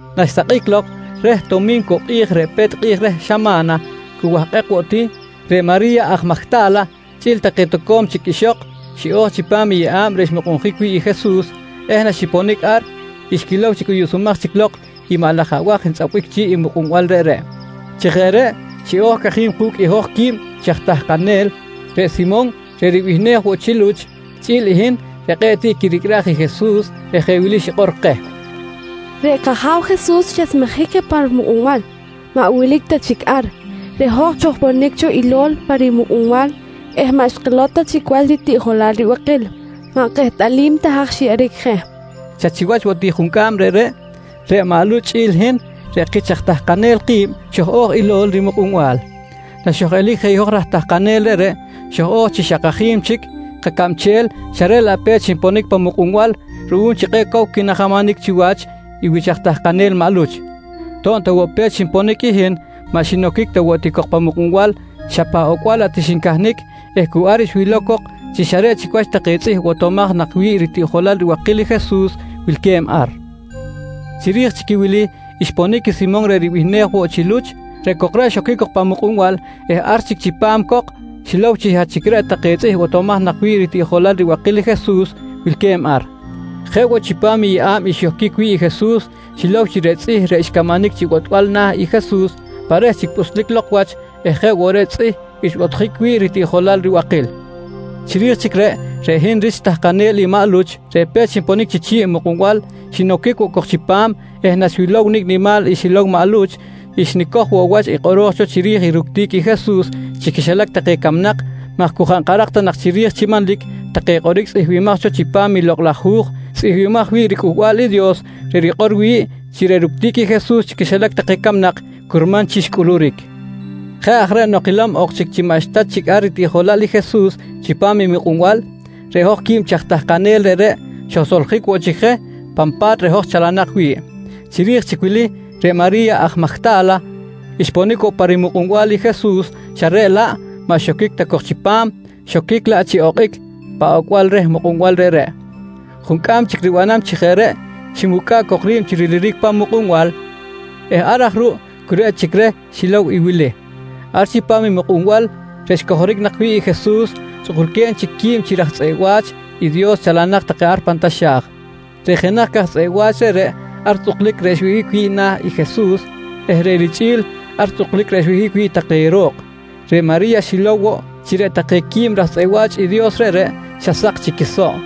Naxsakꞌic lok reh Tomincuꞌ kꞌi̱j reꞌ pe̱t kꞌi̱j reh xama̱na, cu wahkꞌek woꞌ ti, reꞌ Mari̱ya aj Majta̱la chꞌi̱l take toco̱m ixok xiꞌo̱j chipam i yeꞌa̱b reꞌ xmuhkic wi̱ꞌ i Jesus eh naxiponic ar xquilow chi cꞌuyuꞌsumaj chic lok i maꞌ laj abaj ntzꞌapbic chi̱ꞌ i mukꞌunbal reꞌreꞌ. Chi jeꞌ reꞌ xiꞌo̱j cajim ku̱cꞌ i hoj quib chi aj tahkanel, reꞌ Simon reꞌ ribihnej woꞌ chi Luch, chꞌi̱l i hin reꞌ kꞌe̱ꞌ tiꞌ quiricꞌraj i Jesus eh jeꞌ wili xikꞌor keh: «Reꞌ kAja̱w Jesus xesmejic je pan mukꞌunbal, maꞌ wilic ta chic ar. Reꞌ hoj xojponic cho ilo̱l pa rimukꞌunbal eh maꞌ xkilow ta chic wach ritiꞌjolal ribakil. Maꞌ kehtꞌalim ta haj xyeꞌeric je, nqui xikꞌor. Xa chiwach woꞌ ti juncꞌam reꞌreꞌ, reꞌ maꞌ Luch chꞌi̱l i hin reꞌ kich aj tahkanel ki̱b, xoj-o̱j ilo̱l rimukꞌunbal. Naxoj-elic je i hoj raj tahkanel reꞌreꞌ, xoj-o̱j chi xa kajim chic kacabchel xa reꞌ laꞌ pe̱t xinponic pan mukꞌunbal ruꞌum chi kꞌe̱ꞌ cow quinajamanic chiwach i wich aj tahkanel maꞌ Luch. To̱b ta woꞌ pe̱t xinponic i hin, maꞌ xinoquic ta ti cok pan mukꞌunbal xa pan ocbal laꞌ ti xincahnic eh cu ar xwilow cok chi xa reꞌ chic wach take tzꞌih botomaj nak wi̱ꞌ ritiꞌjolal ribakil i Jesus wilque̱b ar. Chiri̱j i wili xponic i Simon reꞌ ribihnej woꞌ chi Luch. Reꞌ cok reꞌ xoquic cok pan mukꞌunbal eh ar chic chipam cok, xilow chi xa chic reꞌ take tzꞌih botomaj nak wi̱ꞌ i ritiꞌjolal ribakil i Jesus wilque̱b ar. Jeꞌ woꞌ chipam i yeꞌa̱b xyohquic wi̱ꞌ i Jesus xilow chi reꞌ tzꞌih reꞌ xcamanic chi botbal na̱ i Jesus pa reh chic pꞌuslic lok wach eh jeꞌ woꞌ reꞌ i tzꞌih xbotjic wi̱ꞌ ritiꞌjolal ribakil. Chiri̱j chic reꞌ, reꞌ hin rich tahkanel i maꞌ Luch, reꞌ pe̱t xinponic chi chi̱ꞌ mukꞌunbal xinoquic woꞌ cok chipam eh naxwilow nicꞌ nimal i xilow maꞌ Luch, xnicoj woꞌ wach i kꞌoro̱j cho chiri̱j i ructic i Jesus chi quixilac take camnak maj cu jaꞌ nkarak ta nak chiri̱j chi manlic take kꞌoric tzꞌihmbimaj cho chipam i Lokꞌ laj Hu̱j tzꞌihmbimaj wi̱ꞌ riCꞌuhbal i Dios, reꞌ rikꞌor wi̱ꞌ chi reꞌ ructic i Jesus chi quixilac take camnak, curman chi xcꞌuluric. Jeꞌ aj reꞌ, nok kilom ok chic chi maꞌxta chic ar ritiꞌjolal i Jesus chipam i mukꞌunbal, reꞌ hoj quib chi aj tahkanel reꞌreꞌ, xojsoljic woꞌ chic je pan pa̱t reꞌ hoj chalanak wi̱ꞌ. Chiri̱j chic wili reꞌ Mari̱ya aj Majta̱la xponic woꞌ pa rimukꞌunbal i Jesus xa reꞌ laꞌ maꞌ xoquic ta cok chipam, xoquic laꞌ chi okꞌic pan ocbal reh mukꞌunbal reꞌreꞌ. Juncꞌam chic ribanam chi jeꞌ reꞌ, ximucꞌa̱ꞌ cok ri̱b chi riliric pa̱m i mukꞌunbal, eh ar aj ruꞌ cu reꞌ chic reh xilow i wili: Ar chipam i mukꞌunbal reꞌ xcojoric nak wi̱ꞌ i Jesus tzꞌukulque̱b chic quib chi raj tzꞌeꞌ wa̱ch i Dios chalanak take pan taxa̱j. Reꞌ jenaj queh take aj tzꞌeꞌ wa̱ch reꞌreꞌ ar tzꞌuklic reꞌ xwihꞌic wi̱ꞌ na̱ i Jesus eh reꞌ richꞌi̱l ar tzꞌuklic reꞌ xwihꞌic wi̱ꞌ take ro̱k. Reꞌ Mari̱ya xilow woꞌ chi reꞌ take quib chi raj tzꞌeꞌ wa̱ch i Dios reꞌreꞌ xa saksa̱k chic i quisoꞌ.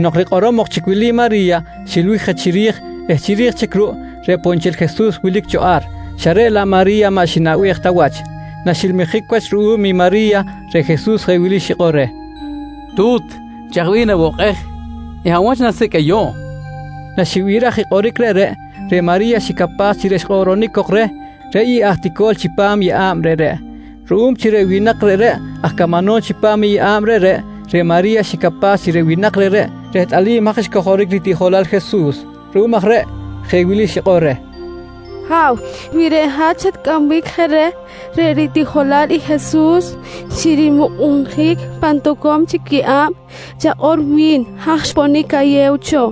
Nok rikꞌorom ok chic wili Mari̱ya, xilbic je chiri̱j eh chiri̱j ruꞌ, reꞌ poꞌ nchel i Jesus wilic cho ar xa reꞌ laꞌ Mari̱ya maꞌ xinaꞌbej ta wach. Naxilmijic wach ruꞌum i Mari̱ya, reꞌ Jesus jeꞌ wili xikꞌor reh: «Tu̱t, chaj bih nawokꞌej eh hab wach nasicꞌ ayuꞌ? nqui reh. Naxibiraj i kꞌoric reꞌreꞌ, reꞌ Mari̱ya xicapaj chi reꞌ xkꞌoꞌronic cok reh reꞌ i aj ilol tic chipam yeꞌa̱b reꞌreꞌ. Ruꞌum chi reꞌ winak reꞌreꞌ aj camanom chipam i yeꞌa̱b reꞌreꞌ, reꞌ Mari̱ya xicapaj chi reꞌ winak reꞌreꞌ rehtꞌalim haj xcojoric ritiꞌjolal i Jesus. Ruꞌum aj reꞌ jeꞌ wili xikꞌor reh: «Ha̱w, wi reꞌ hat xatcꞌambic je reh ritiꞌjolal i Jesus chi rimukꞌunjic pan toco̱m chic yeꞌa̱b, chakꞌor wi̱n haj xponic ayew cho,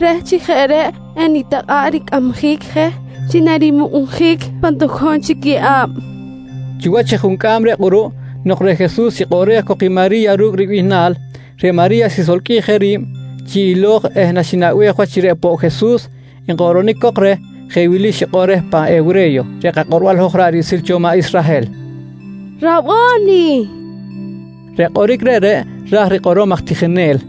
reh chi jeꞌ reꞌ enitakꞌa̱ꞌ ricꞌamjic je chi narimukꞌunjic pan toco̱m chic yeꞌa̱b, nqui Mari̱ya. Chiwach i juncꞌam reꞌ kꞌuruꞌ nok reꞌ Jesus xikꞌoꞌrej cok i Mari̱ya ru̱cꞌ ribihnal, reꞌ Mari̱ya xisolqꞌuij ri̱b chi ilo̱j eh naxinaꞌbej wach chi reꞌ poꞌ Jesus nkꞌoꞌronic cok reh, jeꞌ wili xikꞌor reh pan hewre̱yo reꞌ kakꞌorbal hoj ra̱ꞌ riꞌsil cho maꞌ Israhel: «Rabo̱ni! nqui reh. Reꞌ kꞌoric reꞌreꞌ ra̱j rikꞌorom “aj tijinel”.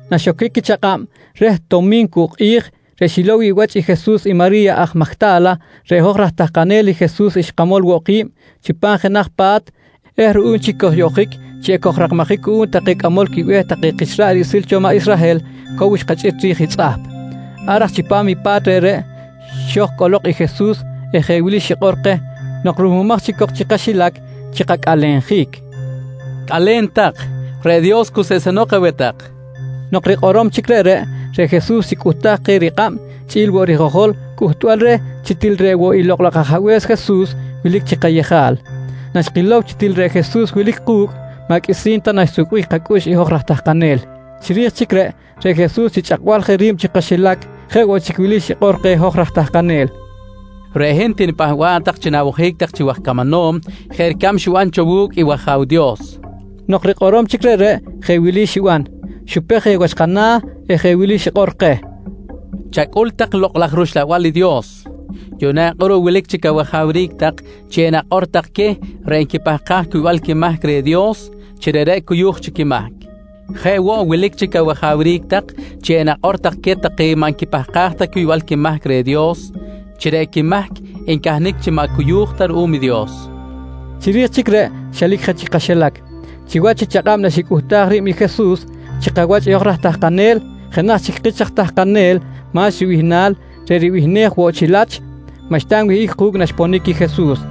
Naxoquic i chakꞌab reh Tomincuꞌ kꞌi̱j reꞌ xilow wi̱ꞌ wach Jesus i Mari̱ya aj Majta̱la, reꞌ hoj raj tahkanel i Jesus xkamol woꞌ ki̱b chipam jenaj pa̱t eh ruꞌum chi kojyoꞌjic chi ekojrakmajic cuꞌum take cꞌamol quibe̱h take kich ra̱ꞌ riꞌsil cho maꞌ Israhel cow xkachꞌit ri̱j i tzꞌahp. Ar aj chipam i pa̱t reꞌreꞌ xo̱j cꞌolok i Jesus eh jeꞌ wili xikꞌor keh nok ruhmumaj chic cok chi kaxilac chi kacꞌalenjic: «Cꞌale̱n tak, reꞌ Dios cuseꞌsenok aweh tak, nqui keh. Nok rikꞌorom chic reꞌreꞌ, reꞌ Jesus xicꞌuhtaj keh rikꞌab chꞌi̱l i rijojol cꞌuhtbal reh chi til reꞌ woꞌ i Lokꞌ laj Ajabe̱s Jesus wilic chi kayejal. Naxkilow chi til reꞌ Jesus wilic ku̱cꞌ, maꞌ qꞌuisi̱n ta naxsukbic kacꞌux i hoj raj tahkanel. Chiri̱j chic reꞌ, reꞌ Jesus chi chꞌakbal je ri̱b chi kaxilac jeꞌ woꞌ chic wili xikꞌor keh hoj raj tahkanel: «Reꞌ hin tinipahba̱ꞌ tak chi na̱wojic tak chi waj camanom jeꞌ ricab xiban cho wu̱cꞌ i wAja̱w Dios, nqui keh. Nok rikꞌorom chic reꞌreꞌ jeꞌ wili xiban: Xupej je wach kana̱ eh jeꞌ wili xikꞌor keh: «Chacꞌul tak i Lokꞌ laj rUxlabal i Dios. Yuꞌna kꞌuruꞌ wilic chic awajawric tak chi enakꞌor tak queh reꞌ nquipahkaj cuybal quimahc reh Dios, chi reꞌreꞌ ricuy quimahc. Jeꞌ woꞌ wilic chic awajawric tak chi enakꞌor tak queh take maꞌ nquipahkaj ta cuybal quimahc reh Dios, chi reꞌ quimahc ncahnic chi maꞌ cuyu̱j ta ruꞌum i Dios, nqui Jesus keh. Chiri̱j chic reꞌ xelic je chi kaxilac. Chiwach i chakꞌab naxicꞌuhtaj ri̱b i Jesus chi kawach i hoj raj tahkanel, jenaj chic kich aj tahkanel Ma̱x ribihnal reꞌ ribihnej woꞌ chi Lach, maꞌxta nwihꞌic ku̱cꞌ naxponic i Jesus.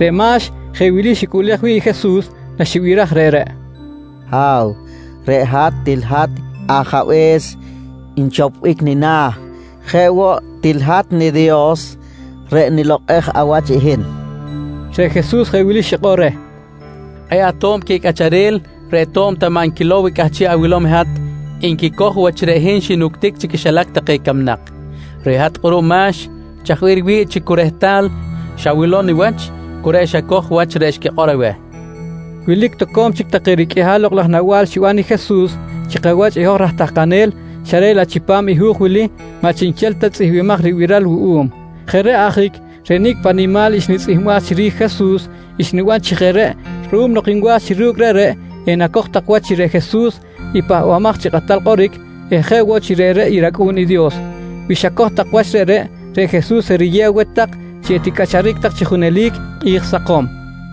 Reꞌ Ma̱x jeꞌ wili xicꞌuꞌlej wi̱ꞌ i Jesus naxibiraj reꞌreꞌ: «Ha̱w, reꞌ hat til hat i ajabe̱s nchopbic nina̱. Jeꞌ woꞌ til hat niDios reꞌ nilokꞌej awach i hin, nqui Ma̱x. Reꞌ Jesus jeꞌ wili xikꞌor reh: «Kꞌe̱ꞌ ato̱b queh cꞌacharel reꞌ to̱b ta maꞌ nquilow i cꞌahchiꞌ awilom i hat, nquicoj wach chi reꞌ hin xinuctic chi quixilac take camnak. Reꞌ hat kꞌuruꞌ Ma̱x, chaj bih riwi̱ꞌ chi cu rehtal xawilow niwach cu reꞌ xacoj wach reꞌ xquikꞌor aweh, nqui Jesus. Wilic toco̱m chic take riqꞌuihal lokꞌ laj nawa̱l xiban i Jesus chi kawach i hoj raj tahkanel xa reꞌ laꞌ chipam i hu̱j wili maꞌ chiꞌnchel ta tzꞌihmbimaj ribiral wuꞌum. Jeꞌ reꞌ ajic reꞌ nicꞌ paꞌ nimal xnitzꞌihmbaj chiri̱j i Jesus, xniban chi jeꞌ reꞌ ruꞌum nok nwa̱j chi ru̱cꞌ reꞌreꞌ enacoj tak wach chi reꞌ Jesus, reꞌ i Pahbamaj chi Kꞌatal Kꞌoric eh jeꞌ woꞌ chi reꞌreꞌ i rAcꞌu̱n i Dios. Wi xacoj tak wach reꞌreꞌ, reꞌ Jesus eriyew aweh tak chi eticꞌacharic tak chi junelic kꞌi̱j sakom.